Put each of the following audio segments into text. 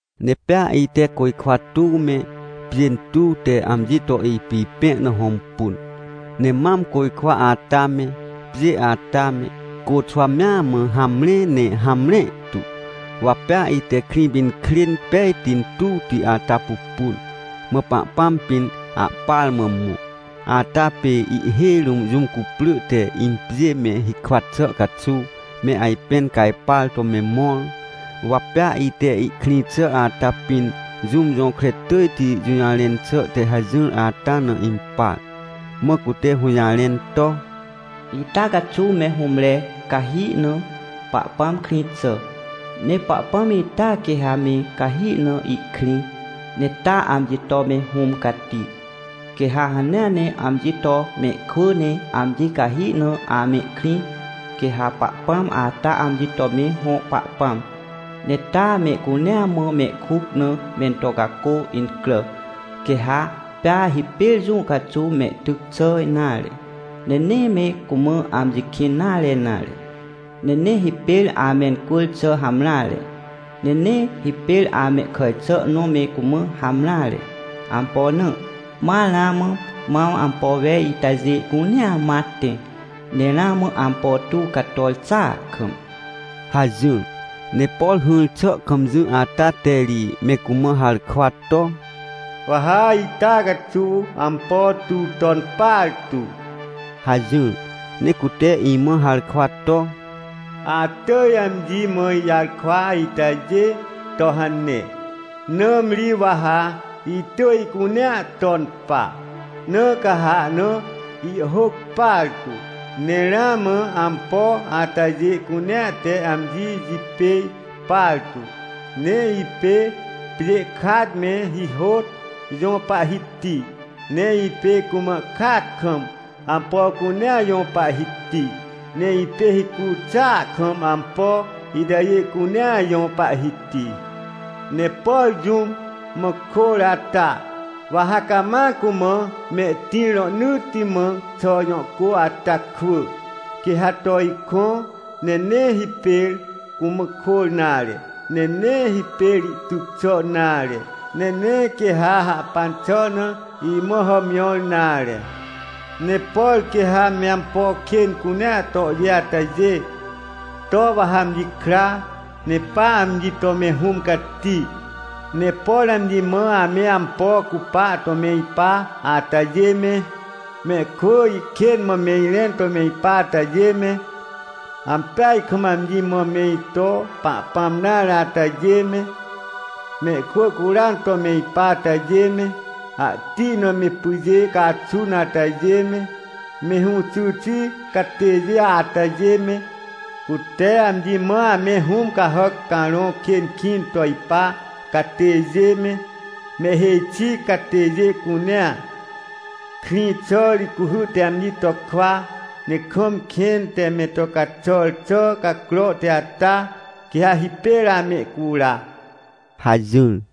Ne pea ite côjkwa tuw me, pjê tuw te amji to ipipẽ na hõmpun. Ne mam côjkwa ata me, pjê ata me, côxwa mea mã hamre ne hamre tu. Wa pea ite Krĩpinkrên pejti tuwti ata pupun, mã Pahpãm pĩn ahpar mã mõ, ata pê ihhêj rũm jũm cuprỳ te impjên me hikwa xà caxuw, me ajpẽn cajpar to me mõr. Wa pea ite ihkrĩ xà ata pĩn jũm jõkre tỳjti jũjarẽn xà te hajỹr ata na impar, mã cute hũjarẽn to: — Ita caxuw me hũmre cahi na Pahpãm krĩ xà. Ne Pahpãm ita quê ha me cahi na ihkrĩ, ne taa amji to me Hũm Cati. Quê ha hanea ne amji to mehkwỳ ne amji cahi na amehkrĩ, quê ha Pahpãm ata amji to me hõ Pahpãm. Ne taa mehcunea mã mehkuc na mento cacô incrà. Quê ha pea hipêr jũ caxuw mehtyc xà nare, ne nee me cumã amji kĩn nare nare, ne nee hipêr amencwỳr xà hamreare, ne nee hipêr amehkàj xà nõ me cumã hamreare. Ampo na? Ma ramã mam ampo wej itajê cunea ma tẽ, ne ramã ampo tuw cator xàa kam — hajỹr. Ne por hỹr xà kam jỹ ata te ri me cumã harkwa to: — Wa ha ita caxuw ampo tuw ton partu — hajỹr. Ne cute imã harkwa to: — Atỳj amji mã ijarkwa itajê to hane, nãmri wa ha itỳj ihcunea ton pa, na ca ha ahna ihhôc partu. — Ne ramã ampo atajê cunea te amji jipêj partu. Ne ipê pjê kat me hihôt jõ Pahhiti, ne ipê cumã kat kam ampo cunea jõ Pahhiti, ne ipê hicu xàa kam ampo itajê cunea jõ Pahhiti. Ne por jũm mã kôr ata, wa ha cama cumã mehtĩr rohnỳtti mã xà jõ cô ata kwỳ, quê ha to ikõ, ne nee hipêr cumã kôr nare, ne nee hipêr ihtyc xà nare, ne nee quê ha hahpan xà na imã hàmjõr nare. Ne por quê ha me ampo kên cunea tohjê atajê, to wa ha amji kra, ne pa amji to me Hũm Cati. Ne por amji mã ame ampo cupa to me ipa atajê me, mehkwỳ ihkên mã me irẽn to me ipa atajê me, ampeaj kam amji mã me ito Pahpãm nare atajê me, mehkwỳ curan to me ipa atajê me, ahti na me pyjê caxun atajê me, me hũxy xi catêjê atajê me, cute amji mã ame hũm cahàc carõ kên kĩn to ipa catêjê me, mehhêj xi catêjê cunea, krĩ xà ri cuhy te amji to kwa, ne kam kẽn te me to caxàr xà cacrohti ata, quê ha hipêr amehcura — hajỹr.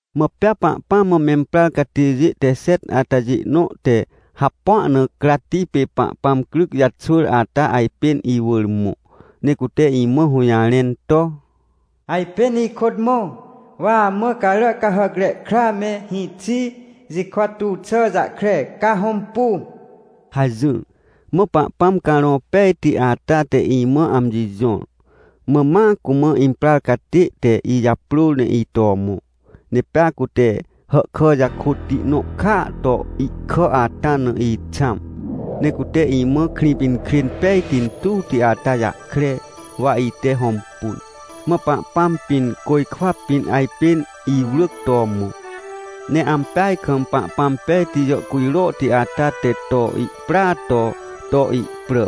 Mã pea Pahpãm mã memprar catêjê te xet atajê nõ te hapua na cratti pê Pahpãm cryc jaxwỳr ata ajpên iwỳr mõ, ne cute imã hũjarẽn to: — Ajpên ikôt mõ, wa amã Caràcahàcre Kra me hĩxi jikwa tuw xà jahkre, ca hõmpu — hajỹr. Mã Pahpãm Carõ Pejti ata te imã amji jõr, mã ma cumã imprar catê te ijaprôr ne ito mõ, ne pea cute hahkà jakôtti nõ kàa to ihkà ata na ixãm. Ne cute imã Krĩpinkrên pejti tuwti ata jahkre, wa ite hõmpun, mã Pahpãm pĩn côjkwa pĩn ajpên iwrỳc to mõ. Ne ampeaj kam Pahpãm pejti jàhcujrohti ata te to ihpràa to, to ihprà.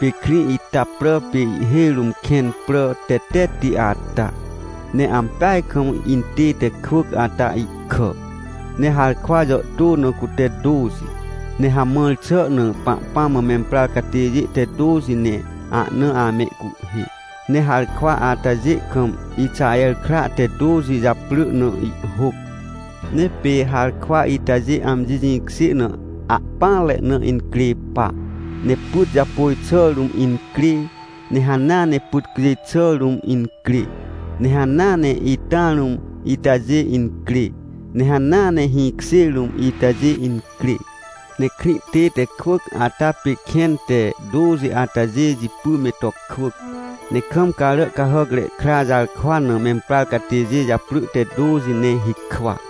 Pê krĩ ita prà pê ihhêj rũm kẽn prà tetetti ata. Ne ampeaj kam intête kwỳc ata ihkà, ne harkwa jàhtô na cute tôxi, ne hamãr xà na Pahpãm mã memprar catêjê te tôxi ne ahna amehcuhhê. Ne harkwa atajê kam Ixaher kra te tôxi japrỳ na ihhôc. Ne pê harkwa itajê amji jĩkjê na ahpỹanre na incrê pa, ne pyt japôj xà rũm incrê, ne hanea ne pyt cjêj xà rũm incrê, ne hanea ne ita rũm itajê incrê, ne hanea ne hĩkjê rũm itajê incrê. Ne krĩ tête kwỳc ata pê kẽn te tôxi atajê jipy me to kwỳc, ne kam Caràcahàcre Kra jarkwa na memprar catêjê japrỳ te tôxi ne hikwa.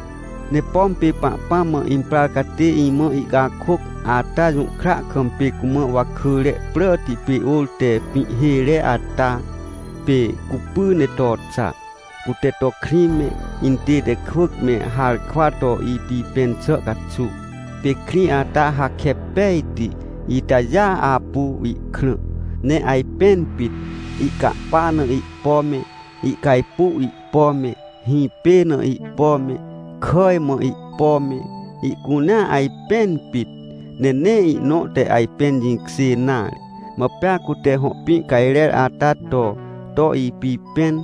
Ne pom pê Pahpãm mã imprar catê imã ihcakôc ata jũhkra kam pê cumã wakỳre pràti pê ôr te pĩhhêre ata. Pê cupy ne to xa, cute to krĩ me, intête kwỳc me, harkwa to ipipẽn xà caxuw. Pê krĩ ata hakep pejti itajêa apu ihkrã, ne ajpẽn pit. Ihcahpa na ihpo me, ihcajpuw ihpo me, hĩpê na ihpo me, kàj mã ihpo me, ihcunea ajpẽn pit, ne nee ihnõ te ajpẽn jĩkjê nare. Mã pea cute hõ pĩ cajrer ata to ipipẽn,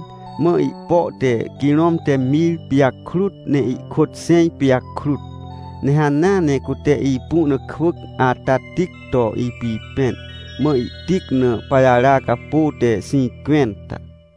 mã ihpo te quirom te mir pijakrut ne ihkôt xẽj pijakrut. Ne hanea ne cute ipu na kwỳc ata tic to ipipẽn. Mã ihtic na pajara capô te xĩncwẽnta.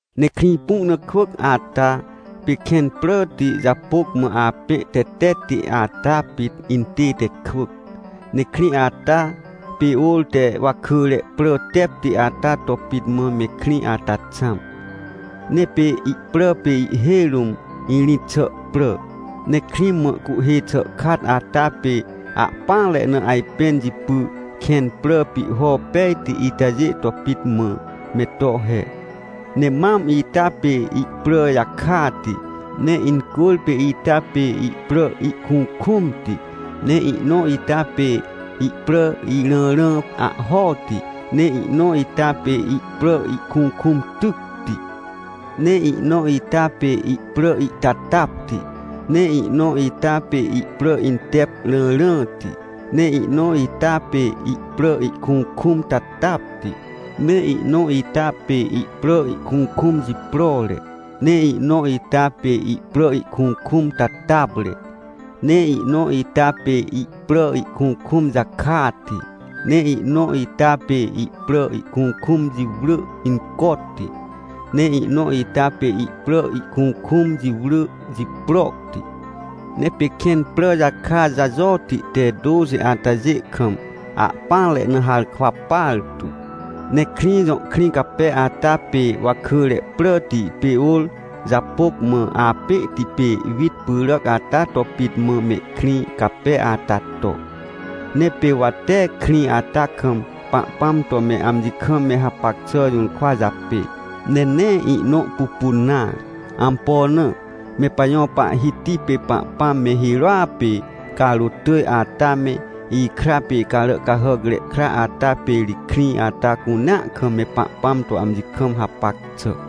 Ne krĩ pu na kwỳc ata, pê kẽn pràti japôc mã apẽ tetetti ata pit intête kwỳc. Ne krĩ ata, pê ôr te wakỳre prà tepti ata to pit mã me krĩ ata xãm, ne pê ihprà pê ihhêj rũm irĩt xà prà. Ne krĩ mã cuhhê xàkat ata pê ahpỹanre na ajpẽn jipy, kẽn prà pihho pejti itajê to pit mã me to he. Ne mam ita pê ihprà jakati, ne incwỳrpê ita pê ihprà ihkukũmti, ne ihnõ ita pê ihprà irãrã ahhoti, ne ihnõ ita pê ihprà ihkukũm tycti. Ne ihnõ ita pê ihprà ihtatapti, ne ihnõ ita pê ihprà intep rãrãti, ne ihnõ ita pê ihprà ihkukũm tatapti, ne ihnõ ita pê ihprà ihkukũm jiprore, ne ihnõ ita pê ihprà ihkukũm tatapre, ne ihnõ ita pê ihprà ihkukũm jakati, ne ihnõ ita pê ihprà ihkukũm jiwrỳ incoti, ne ihnõ ita pê ihprà ihkukũm jiwrỳ jiproti. Ne pê kẽn prà jaka jajoti te tôxi atajê kam, ahpỹanre na harkwa partu. Ne krĩ jõ krĩ cape ata, pê wakỳre pràti pê ôr japôc mã apẽhti pê wit pyràc ata to pit mã mehkrĩ cape ata to. Ne pê wa tee krĩ ata kam Pahpãm to me amji kam me hapac xà jũrkwa japê, ne nee ihnõ pupun nare. Ampo na? Me pajõ Pahhiti pê Pahpãm me hirôa pê carôt tỳj ata me, ikra pê Caràcahàcre Kra ata pê ri krĩ ata cunea kam me Pahpãm to amji kam hapac xà.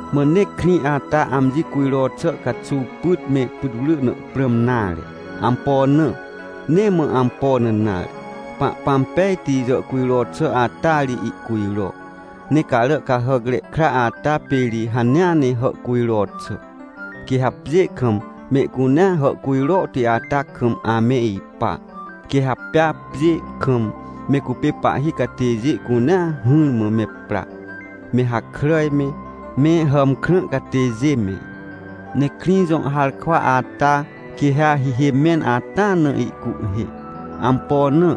Mã nee krĩ ata amji cujro xà caxuw pyt me putwrỳ na prãm nare. Ampo na? Nee mã ampo na nare, Pahpãm pejti jàhcujro xà ata ri ihcujro, ne Caràcahàcre Kra ata pê ri hanea ne hàhcujro xà. Quê ha pjê kam mehcunea hàhcujrohti ata kam ame ipa. Quê ha pea pjê kam me cupê pahhi catêjê cunea hỹrmã me pra, me hakràj me, me hàmkrã catêjê me. Ne krĩ jõ harkwa ata, quê ha hihê mẽn ata na ihcuhhê. Ampo na?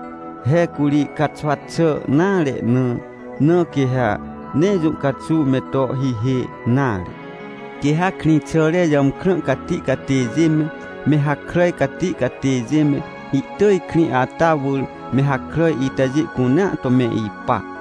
He curi caxwa xà nare na, na quê ha nee jũ caxuw me to hihê nare. Quê ha krĩxàre jàmkrã cati catêjê me, me hakràj cati catêjê me, ihtỳj krĩ ata wỳr me hakràj itajê cunea to me ipa.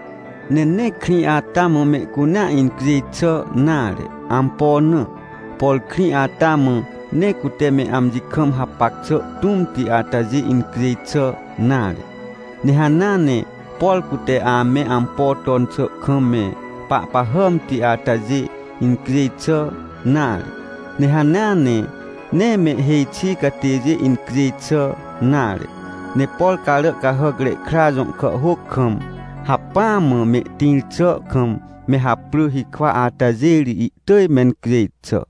Ne nee krĩ ata mã mehcunea incjêj xà nare. Ampo na? Por krĩ ata mã nee cute me amji kam hapac xà tũmti atajê incjêj xà nare. Ne hanea ne, por cute ame ampo ton xà kam me pahpahàmti atajê incjêj xà nare. Ne hanea ne, nee mehhêj xi catêjê incjêj xà nare. Ne por Caràcahàcre Kra jõ kàhhôc kam hacpỹa mã mehtĩr xà kam me haprỳ hikwa atajê ri ihtỳj mencjêj xà.